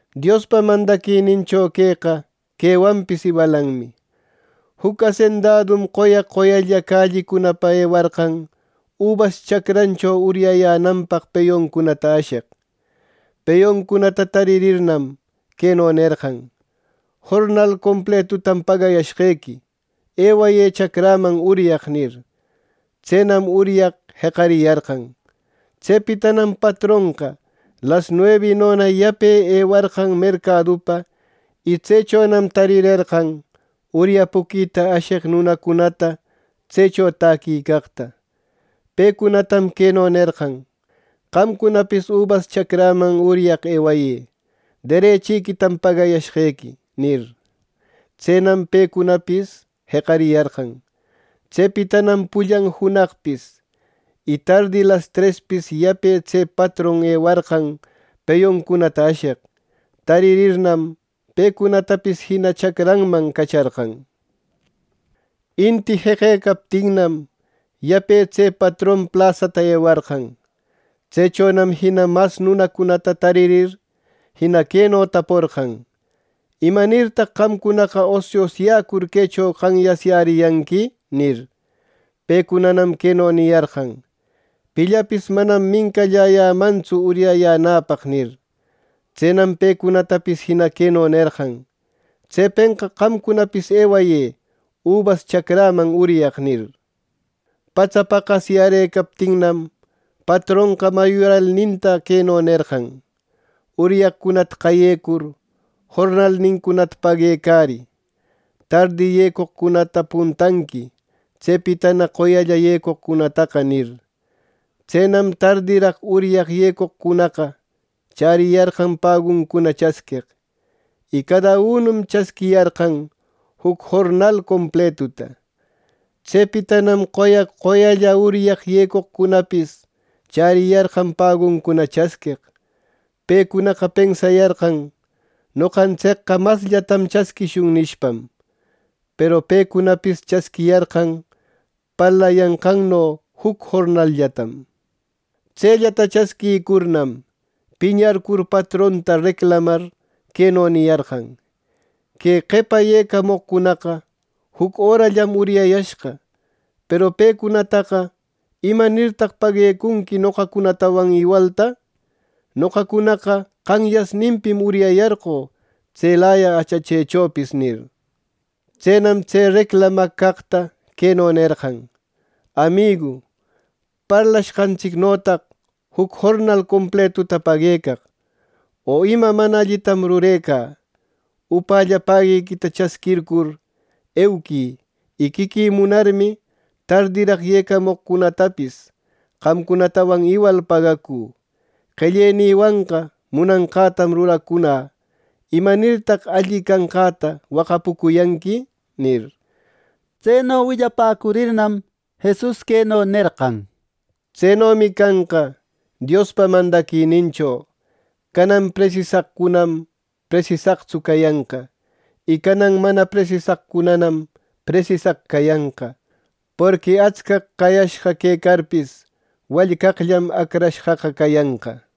“Diospa mandaquinincho queqa quewanpis iwalanmi: Juc asendadum qoya qoyalla callicunapa ewarqan ubas chacrancho uryayänanpaq peyuncunata asheq. Peyuncunata taririrnam, queno nerqan: ‘Jornal completutam pagayashqequi; ewayë chacräman uryaq’ nir. Tsenam uryaq jeqariyarqan. Tsepitanam patronqa las nuebinona yape ewarqan mercadupa y tsechonam tarirerqan uryapuquita asheq nunacunata tsecho täquicaqta. Pecunatam queno nerqan: ‘Qamcunapis ubas chacräman uryaq ewayë, derechiquitam pagayashqequi’ nir. Tsenam pecunapis jeqariyarqan. Tsepitanam pullan junaqpis y tardi las trespis yape tse patron ewarqan peyuncunata asheq. Taririrnam, pecunatapis jina chacranman cacharqan. Inti jeqecaptinnam, yape tse patron plasata ewarqan. Tsechonam jina mas nunacunata taririr, jina queno taporqan: ‘¿Imanirtaq qamcunaqa osiosyäcur quecho qanyasyäriyanqui?’ nir. Pecunanam queno niyarqan: ‘Pillapis manam mincallayämantsu uryayänäpaq’ nir. Tsenam pecunatapis jina queno nerqan: ‘Tsepenqa qamcunapis ewayë ubas chacräman uryaq’ nir. “Patsa paqasyärëcaptinnam, patronqa mayuralninta queno nerqan: ‘Uryaqcunata qayecur jornalnincunata paguecarï. Tardi yecoqcunata puntanqui, tsepitana qoyalla yecoqcunataqa’ nir. Tsenam tardiraq uryaq yecoqcunaqa chäriyarqan paguncuna chasqueq. Y cada unum chasquiriyarqan juc jornal completuta. Tsepitanam qoya qoyalla uryaq yecoqcunanapis chäriyarqan paguncuna chasqueq. Pecunaqa pensayarqan, ‘Noqantsicqa masllatam chasquishun’ nishpam. Peru pecunapis chasquiyarqan parlayanqanno juc jornalllatam. Tsellata chasquïcurnam, piñarcur patronta reclamar, queno niyarqan: ‘Que qepa yecamoqcunaqa juc örallam uryayashqa. Peru pecunataqa, ¿imanirtaq paguecunqui noqacunatawan iwalta! Noqacunaqa qanyasninpim uryayarqö tselaya achachechopis’ nir. Tsenam tse reclamaq caqta queno nerqan: ‘Amigu, parlashqantsicnotaq juc jornal completuta paguecaq, o ¿ima mana allitam rurecä! Upälla paguiquita chasquircur euquï y quiquï munarmi tardiraq yecamoqcunatapis qamcunatawan iwal pagacü. Qellenïwanqa munanqätam ruracunä ¿imanirtaq alli canqäta waqapucuyanqui!’” nir. Tseno willapäcurirnam, Jesus queno nerqan: —Tsenomi canqa Diospa mandaquinincho. Canan presisaqcunam presisaqtsu cayanqa; y canan mana presisaqcunanam presisaq cayanqa, ˻porqui atscaq qayashqa quecarpis wallcaqllam acrashqaqa cayanqa˼ —nir.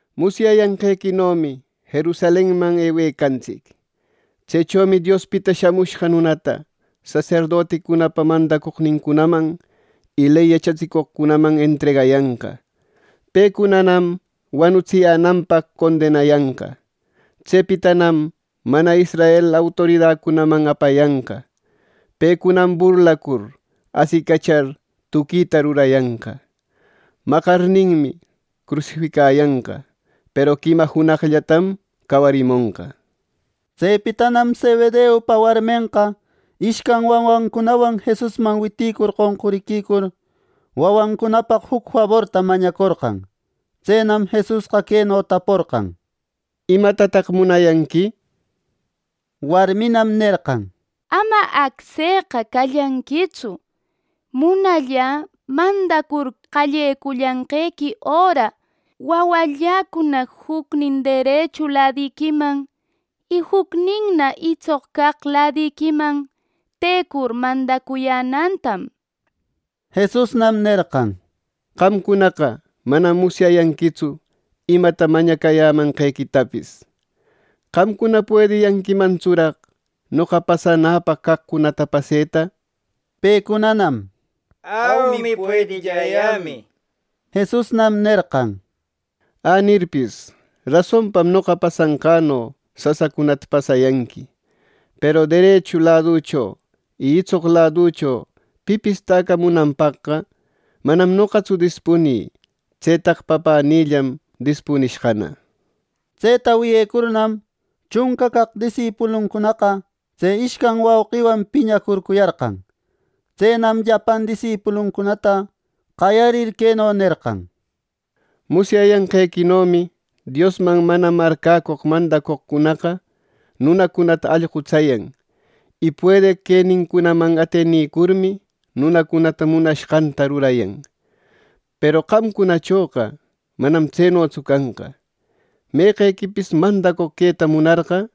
—Musyayanqequinomi Jerusalenman ewecantsic. Tsechomi Diospita Shamushqa Nunata saserdoticunapa mandacoqnincunaman y ley yachatsicoqcunaman entregayanqa. Pecunanam wanutsiyänanpaq condenayanqa. Tsepitanam mana israel autoridacunaman apayanqa. Pecunam burlacur asicachar tuquita rurayanqa. Maqarninmi, crusificayanqa; peru quima junaqllatam cawarimonqa —nir. Tsepitanam Zebedeupa warmenqa ishcan wawancunawan Jesusman witïcur qonquriquicur, wawancunapaq juc faborta mañacorqan. Tsenam Jesusqa queno taporqan: —¿Imatataq munayanqui? —nir. Warminam nerqan: —Ama acseqa callanquitsu. Munallä mandacur qallecullanqequi öra wawalläcuna jucnin derechu ladiquiman y jucninna itsoq caq ladiquiman tecur mandacuyänätam —nir. Jesusnam nerqan: —Qamcunaqa manam musyayanquitsu imata mañacayämanqequitapis. ¿Qamcuna puediyanquimantsuraq noqa pasanäpaq caqcunata paseta? —nir. Pecunanam “Aumi, puedilläyämi” niyarqan. Jesusnam nerqan: —Änirpis rasonpam noqa pasanqäno sasacunata pasayanqui; peru derechu laducho y itsoq laducho pipis täcamunanpaqqa manam noqatsu dispunï. Tsetaqa Papänïllam dispunishqana —nir. Tseta wiyecurnam, chunca caq disipuluncunaqa tse ishcan wauqiwan piñacurcuyarqan. Tsenam llapan disipuluncunata qayarir queno nerqan: —Musyayanqequinomi Diosman mana marcäcoq mandacoqcunaqa nunacunata allqutsayan, y puedeq quenincunaman atenicurmi, nunacunata munashqanta rurayan. Peru qamcunachoqa manam tsenotsu canqa. Meqequipis mandacoq queta munarqa,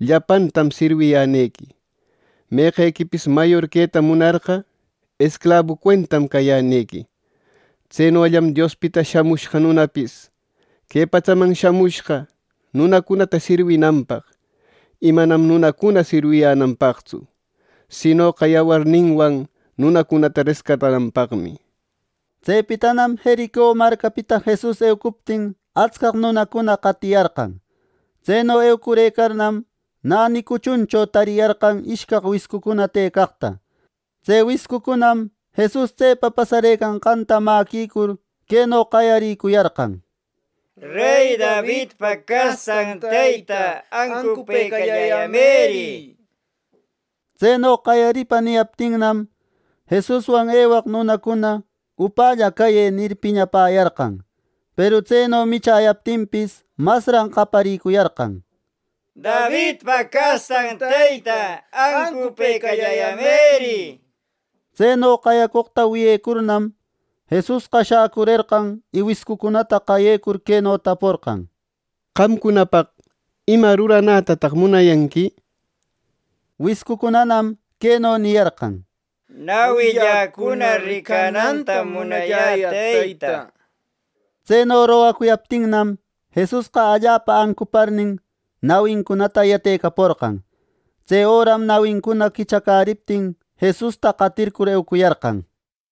llapantam sirwiyänequi. Meqequipis mayor queta munarqa, esclabu cuentam cayänequi. Tsenollam Diospita Shamushqa Nunapis que patsaman shamushqa nunacunata sirwinanpaq, y manam nunacuna sirwiyänanpaqtsu, sinoqa yawarninwan nunacunata rescatananpaqmi. Tsepitanam Jerico marcapita Jesus eucuptin atscaq nunacuna qatiyarqan. Tseno eucurëcarnam, näni cuchuncho tariyarqan ishcaq wiscucuna tëcaqta. Tse wiscucunam Jesus tsepa pasarëcanqanta mäquicur queno qayarïcuyarqan: —¡Rey Davidpa castan Teyta, ancupëcalläyämëri! —nir. Tseno qayaripa niyaptinnam, Jesuswan ewaq nunacuna “¡Upalla cayë!” nir piñapäyarqan. Peru tseno michäyaptinpis, masran qayariyarqan: —¡Davidpa castan Teyta, ancupëcalläyämëri! —nir. Tseno qayacoqta wiyecurnam, Jesusqa shäcurerqan y wiscucunata qayecur, queno taporqan: —Qamcunapaq ¿ima ruranätataq munayanqui? —nir. Wiscucunanam queno niyarqan: —Nawilläcuna ricanantam munalläyä, Teyta —nir. Tseno rogacuyaptinnam, Jesusqa allapa ancuparnin, nawincunata yatecaporqan. Tse öram nawincuna quichacäriptin, Jesusta qatircur eucuyarqan.